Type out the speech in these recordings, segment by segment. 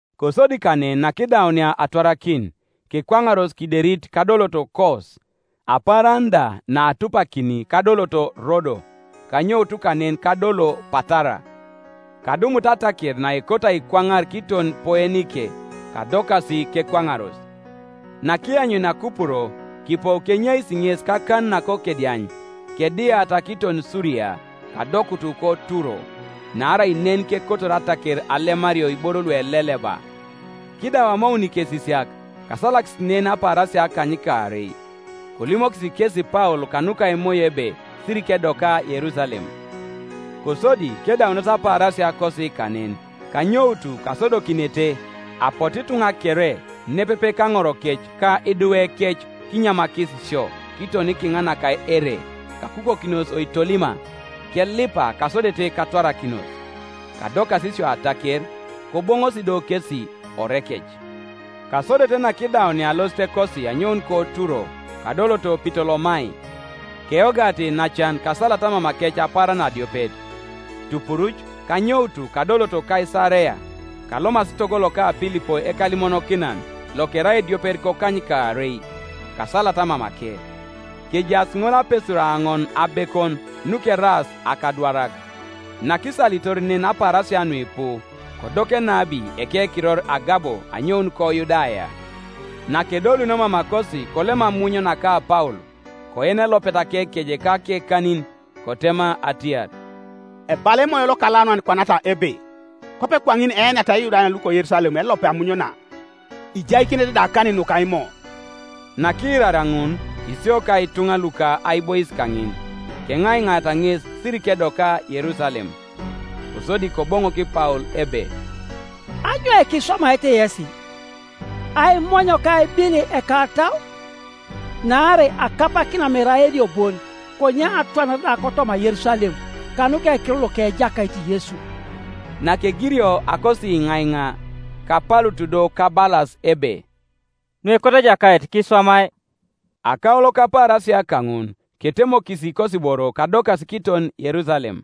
Kosodi kanen nakidaunia atwarakin, kekwaŋaros kiderit kadoloto Kos, apaaran da naatupakini kadoloto Rodo, kanyout kanen kadolo Patara. Kadumutu ataker naekoto aikwaŋar kiton Poenike, kadokasi, kekwaŋaros. Nakianyunia Kupuro kipou kenyeisi ŋes kakan nakokediany, kediata kiton Suria, kadokutu koTuro; naarai nen kekotor ataker alemario iboro lueleleba. Kiidau amoun ikesisiak, kasalakis nen apaarasia akanykaarei. Kolimokis kesi Paul kanuka Emoyo ebe sirikedoka Yerusalem. Kosodi kedaunos apaarasiakosi kanen, kanyoutu kasodokinete; apotu ituŋa kere, nepepe kaŋorokec ka idwekec kinyamakis sio kiton kiŋa naka ere; kakukokinos oitolima kelipa kasodete katwarakinos. Kadokas isio ataker, koboŋosi do kesi orekec. Kasodete nakidaunia alositekosi anyoun koTuro, kadoloto Pitolomai; keyogata iinacan kasalata mamakec apaaran adiopet. Tupuruc kanyoutu kadoloto Kaisarea; kalomasi togo loka Pilipo ekalimonokinan, lokerai ediopet kokanykaarei, kasalata mamake. Kejaas ŋol apesur aoŋon abekon, nukeraas akadwarak. Nakisalitor nen apaarasia nuipu, kodoku enabi ekekiror Agabo anyoun koYudaya. Nakedolunio mamakosi kolem amuny naka Paul, koen elopet akekeje ka akekanin, kotema atiar, “Ebala Emoyo Lokalaunan kwanata ebe, Kwape kwaŋin eeniata Iyudayan luko Yerusalem elopet amuny na, ijaikinete da akanin nuka Imo.” Nakiiraria ŋun, isio ka ituŋa luka aibois kaŋin, keŋaiŋaata ŋes sirikedoka Yerusalem. Kosodi Koboŋok Paul ebe, “Anyoika iswamaete yesi, aimony ka aibil ekatau? Naarai akapakina mere aenio bon, konye atwanare da kotoma Yerusalem, kanuka ekiror loka Ejakait Yesu.” Nakegirio akosiiŋaiŋa, kapalutu do kabalas ebe, “Nuekoto Ejakait kiswamai.” Akaulo kapaarasia kaŋun, ketemokisi ikosiboro kadokasi kiton Yerusalem.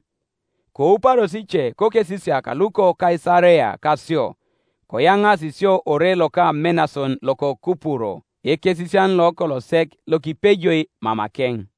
Kouparos ice kokesisiak luko Kaisarea kasio, koyaŋaasi sio ore loka Menason loko Kupuro, ekesisian lokolo sek, lokipejoi mamakeŋ.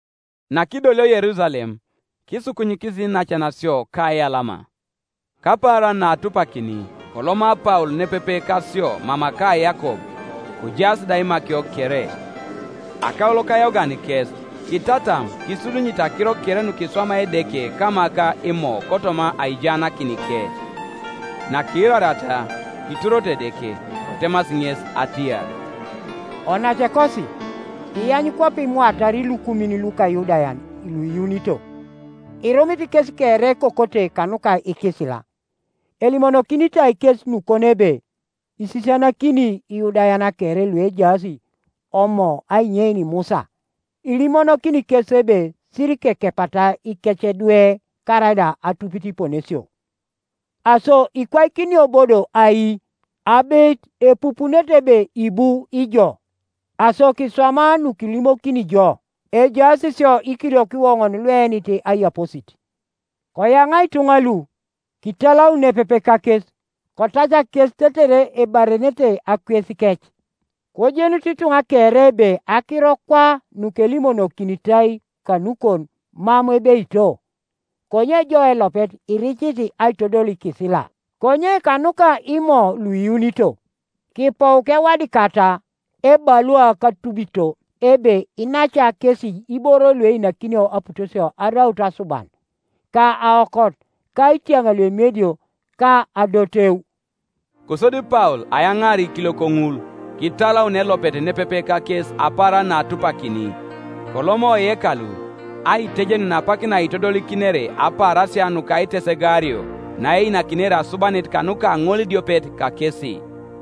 Nakidolio Yerusalem kisukunyikis iinacan sio kaiyalama. Kapaaran naatupakini koloma Paul nepepe kasio mama ka Yakob; kojaas da imakio kere. Akaulo kayogan kes, kitatam kisudunyite akiro kere nukiswamai Edeke kama ka Imo kotoma aijaanakinike. Nakiirariata, kituroto Edeke. Kotemasi ŋes atiar, “Onacekosi, iany kwape imwaatar ilukumin luka Iyudayan luiyuunito, irumit kes kere ekokote kanuka ikisila, elimonokinitai kes nukon ebe isisianakini Iyudayan kere luejaas Omo ainyein Musa, ilimonokini kes ebe sirikekepata ikecedwe karaida atupit iponesio. Aso ikwaikinio bo do ai? Abeit epupunete ebe ibu ijo. Aso kiswama nukilimokini jo, Ejaas sio ikiliok iwoŋon lueenit aiyaposit; koyaŋa ituŋa lu, kitalaun nepepe kakes, kotacak kes tetere ebarenete akwesikec. Kojenut ituŋa kere ebe akiro kwa nukelimonokinitai kanukon mam ebeito, konye jo elopet iricit aitodol ikisila. Konye kanuka Imo luiyuunito, kipou kewadikata ebalua katubito ebe kinaca kesi iboro lueinakinio aputosia araut asuban, ka aokot, ka itiaŋ luemiedio, ka adoteu.” Kosodi Paul ayaŋaar ikiliok ŋul, kitalaun elopet nepepe kakes apaaran naatupakini, koloma oyekalu, aitejenun apak naitodolikinere apaarasia nuka aitesegaario naeinakinere asubanit kanuka ŋolidiopet kakesi.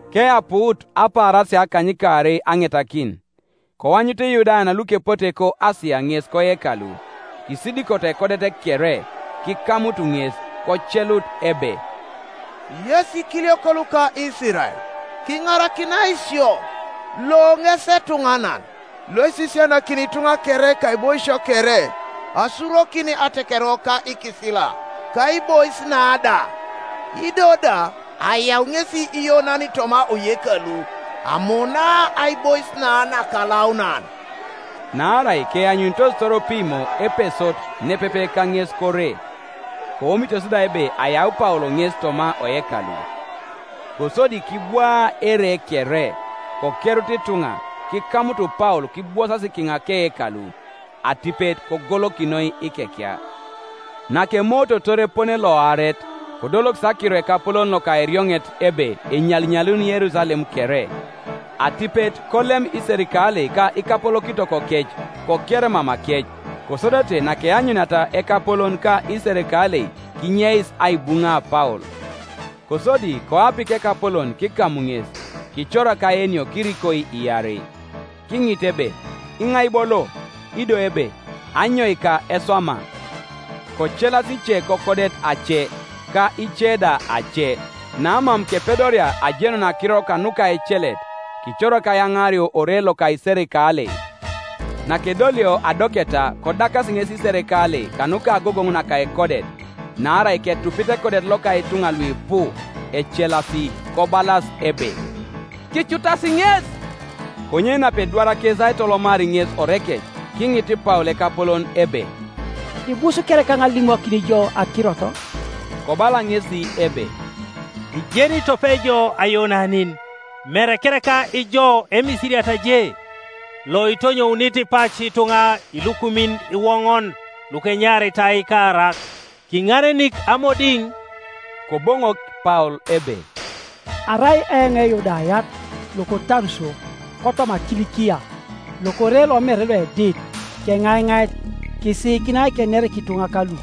Keapuut apaarasia akanykaarei aŋetakin, koanyut lyudayan lukepote koAsia ŋes koyekalu, kisidikoto ekodet kere, kikamutu ŋes, kocelut ebe, “Yes ikiliok luka Isirael, kiŋarakinai sio! Lo ŋes etuŋanan loisisianakini ituŋa kere kaiboisio kere asurokin atekerewok ka ikisila ka aibois na da; ido da ayau ŋesi Iyonanin toma oyekalu, amunaa aibois na nakalaunan.” Naarai keanyunitos Toropimo Epesot nepepe kaŋes kore, koomitos da ebe ayau Paul ŋes toma oyekalu. Kosodi kibwaa ere kere, kokerut ituŋa; kikamutu Paul kibwosasi kiŋa keyekalu, atipet kogolokinoi ikekia. Nakemoototor epone loaret, kodolokis akiro ekapolon loka erioŋet ebe enyalinyalun Yerusalem kere. Atipet kolem iserikalei ka ikapolokitokokec, koker mamakec; kosodete nakeanyuniata ekapolon ka iserikalei kinyeis aibuŋa Paul. Kosodi koapik ekapolon kikam ŋes, kicorak aenio kirikoi iarei, Kiŋit ebe, “Iŋai bo lo?” ido ebe, “Anyoika eswama?” Kocelas ice kokodet ace, ka ice da ace; namam kepedoria ajenun akiro kanuka ecelet, kicorak ayaŋaario ore loka iserikalei. Nakedolio adoketa kodakasi ŋes iserikalei kanuka agogoŋ naka ekodet; naarai ketupit ekodet loka ituŋa luipu, ecelasi, kobalas ebe, “Kicutasi ŋes!” Konye napedwar kes aitolomar ŋes orekec, kiŋit Paul ekapolon ebe, “Ibus kereka eoŋ alimokin jo akirot?” Kobala ŋesi ebe, “Ijeni tope ijo Ayonanin? Mere kereka ijo Emisiriat je, loitonyounit pac ituŋa ilukumin iwoŋon lukenyaritai Ikaarak, kiŋarenik amodiŋ?” Koboŋok Paul ebe, “Arai eoŋ Eyudayat, loko Taruso kotoma Kilikia, lokore lomere loedit; keŋaiŋait, kisiikinai kener kituŋa kalu.”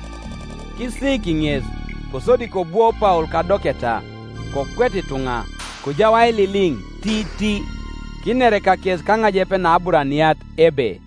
Kisiik ŋes, kosodi kobwo Paul kadoketa, kokwet ituŋa; kojau aililiŋ tiiti, kiner kakes kaŋajep nAburaniat, ebe: